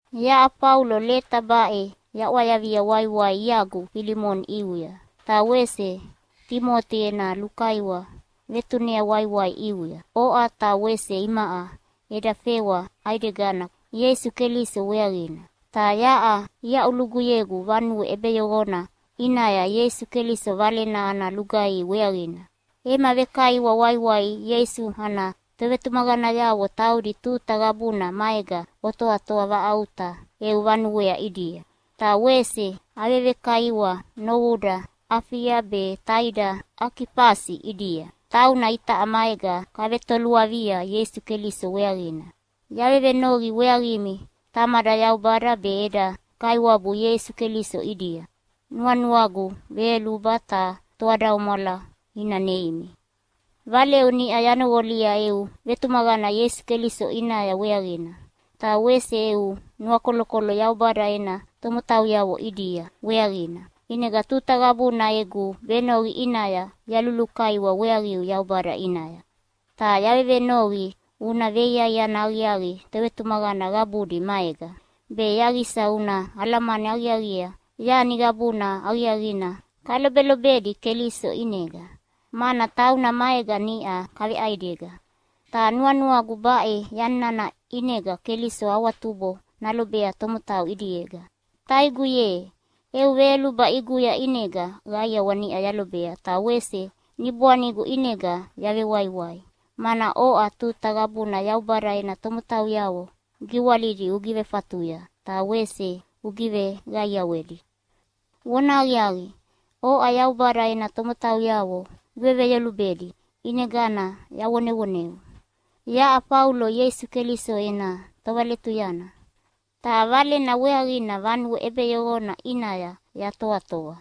Yaʼa Faulo leta baʼe yaʼwayavia waiwai iagu Filimoni ʼiuya. Ta wese Timoti ena lukaiwa vetunea waiwai ʼiuya. Oʼa ta wese imaʼa eda fewa ʼaidegana Ieisu Keliso weaqina. Ta yaʼa iaʼuluguyegu vanue ʼebeyoqona ʼinaya Ieisu Keliso Valena ana lugaihi weaqina. Ema vekaiwa waiwai Ieisu ana tovetumaqanayavo taudi tuta qabuna maega otoatoa vaʼauta eu vanuea ʼidia. Ta wese avevekaiwa novuda Afia be taida Akifasi ʼidia. Tauna itaʼa maega kavetoluavia Ieisu Keliso weaqina. Yavevenoqi weaqimi Tamada Yaubada be eda Kaiwabu Ieisu Keliso ʼidia, nuanuagu veyoluba ta toadaumwala ina neimi. Valeu niʼa yanoqolia eu vetumaqana Ieisu Keliso ʼinaya weaqina, ta wese eu nuakolokolo Yaubada ena tomotauyavo ʼidia weaqina. ʼInega tuta qabuna egu venoqi ʼinaya yalulukaiwa weaqiu Yaubada ʼinaya. Ta yavevenoqi una veiaiana aqiaqi tovetumaqana qabudi maega, be yaqisa una alamani aqiaqiea yani qabuna aqiaqina kalobelobedi Keliso ʼinega, mana tauna maega niʼa kaveʼaidega. Ta nuanuagu baʼe yani nana ʼinega Keliso awatubo nalobea tomotau ʼidiega. Taigu ye, eu veyoluba ʼiguya ʼinega qaiawa niʼa yalobea ta wese niboanigu ʼinega yavewaiwai, mana oʼa tuta qabuna Yaubada ena tomotauyavo giwalidi ugivefatuya ta wese ugiveqaiawedi. Vonahaqiaqi, oʼa Yaubada ena tomotauyavo uveveyolubedi ʼinegana yavonevoneu: Yaʼa Faulo Ieisu Keliso ena tovaletuyana, ta Valena weaqina vanue ʼebeyoqona ʼinaya yatoatoa.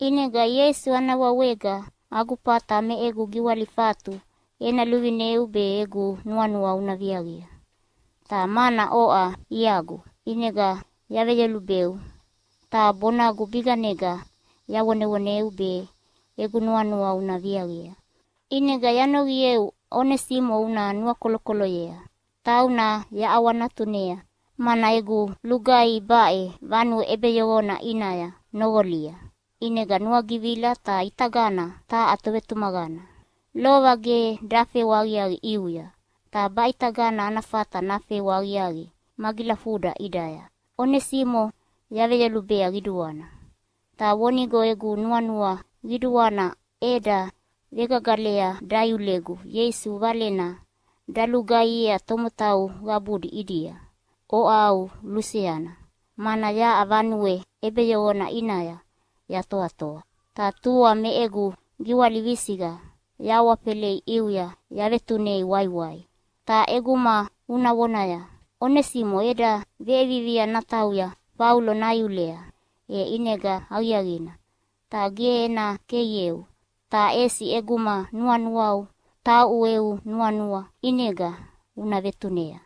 ʼInega Ieisu ana wawega agu fata me egu giwalifatu ena luvineu be egu nuanua una viaqia. Ta mana oʼa iagu, ʼinega yaveyolubeu ta bonagu biganega yavonevoneu be egu nuanua una viaqia. ʼInega yanoqieu Onesimo una nuakolokoloyea. Tauna yaʼawanatunea, mana egu lugaihi baʼe vanue ʼebeyoqona ʼinaya noqolia, ʼinega nuagivila ta ʼitagana taha tovetumaqana. Lova ge dafewa aqiaqi ʼiuya, ta baʼitagana ana fata nafewa aqiaqi magilafuda ʼidaya. Onesimo yaveyolubea qiduana. Ta vonigo egu nuanua qiduana eda vegagalea daiulegu Ieisu Valena dalugaihiea tomotau qabudi ʼidia oʼa au luseana, mana yaʼa vanue ʼebeyoqona ʼinaya yatoatoa. Ta tua me egu giwali visiqa yahawafelei ʼiuya yavetunei waiwai. Ta ʼeguma una vonaya, “Onesimo eda veʼevivia natauya Faulo naiulea.” e ʼinega aqiaqina. Ta ge ena keieu, ta ʼesi ʼeguma nuanuau tauʼu eu nuanua ʼinega una vetunea,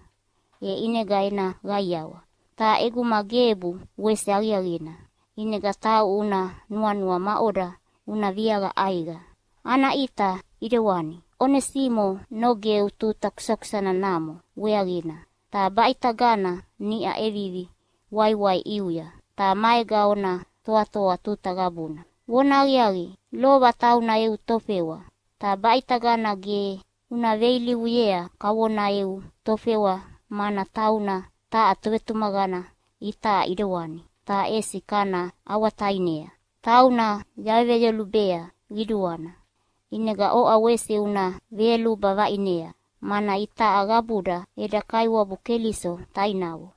e ʼinega ena qaiawa. Ta ʼeguma gebu, wese aqiaqina, ʼinega tauʼu una nuanua maʼoda una viaqa ʼaiqa. Ana ʼita ʼidewani, Onesimo nogeu tuta kukusana namo weaqina, ta baʼitagana niʼa ʼevivi waiwai ʼiuya ta maega ona toatoa tuta qabuna. Vonahaqiaqi, lova tauna eu tofewa. Ta baʼitagana ge una veilivuyea kavona eu tofewa, mana tauna taha tovetumaqana itaʼa ʼidewani, ta ʼesi kana ʼawatainea. Tauna yaveveyolubea qiduana, ʼinega oʼa wese una veyoluba vaʼinea, mana itaʼa qabuda eda Kaiwabu Keliso tainavo.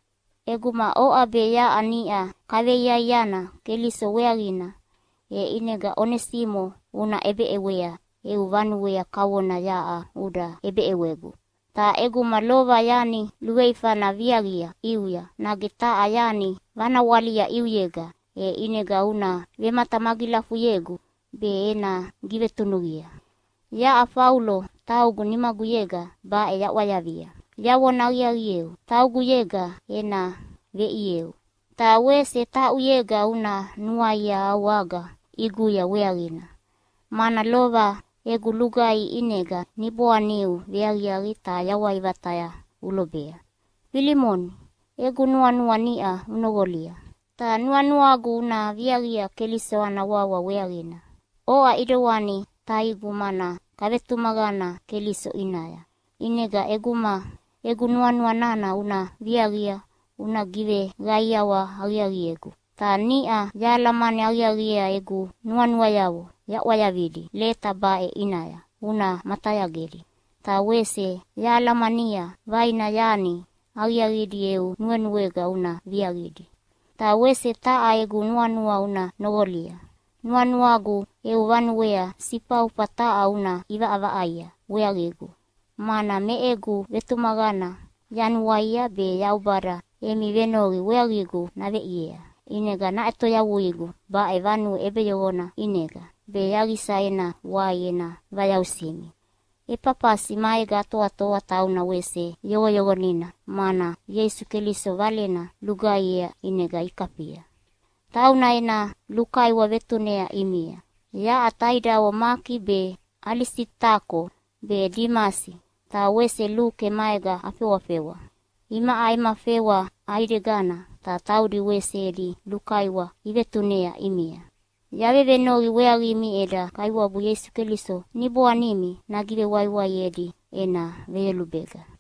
ʼEguma oʼa be yaʼa niʼa kaveiaiana Keliso weaqina, e ʼinega Onesimo una ʼebeʼewea eu vanuea kavona yaʼa uda ʼebeʼewegu. Ta ʼeguma lova yani luveifana viaqia ʼiuya nage taha yani vanawalia ʼiuyega, e ʼinega una vematamagilafuyegu be ena givetunuqia. Yaʼa Faulo taugu nimaguyega baʼe yaʼwayavia. Yavona aqiaqieu, tauguyega ena veʼieu! Ta wese tauʼuyega una nuaia au aga ʼiguya weaqina, mana lova egu lugaihi ʼinega niboaniu veaqiaqi ta yawai vataya ulobea. Filimoni, egu nuanua niʼa unoqolia, ta nuanuagu una viaqia Keliso ana wawa weaqina. Oʼa ʼidewani taigu mana kavetumaqana Keliso ʼinaya, ʼinega ʼeguma egu nuanua nana una viaqia una giveqaiawa aqiaqiegu. Ta niʼa yahalamani aqiaqiea egu nuanuayavo yaʼwayavidi leta baʼe ʼinaya una matayagedi, ta wese yahalamania vaina yani aqiaqidi eu nuenuega una viaqidi. Ta wese taha egu nuanua una noqolia. Nuanuagu eu vanuea sifaufa taha una ʼivaʼavaʼaia weaqigu, mana me egu vetumaqana yanuaia be Yaubada emi venoqi weaqigu naveʼiea ʼinega naʼetoyavuigu baʼe vanue ʼebeyoqona ʼinega, be yaqisa ena wai ena vayausimi. Efafasi maega atoatoa, tauna wese yoqoyoqonina mana Ieisu Keliso Valena lugaihiea ʼinega ikafia. Tauna ena lukaiwa vetunea ʼimia. Yaʼa taidavo Maki be, Alisitako be, Dimasi ta wese Luke maega afewafewa. Imaʼa ema fewa ʼaidegana, ta taudi wese edi lukaiwa ivetunea ʼimia. Yavevenoqi weaqimi eda Kaiwabu Ieisu Keliso niboanimi nagivewaiwaiedi ena veyolubega.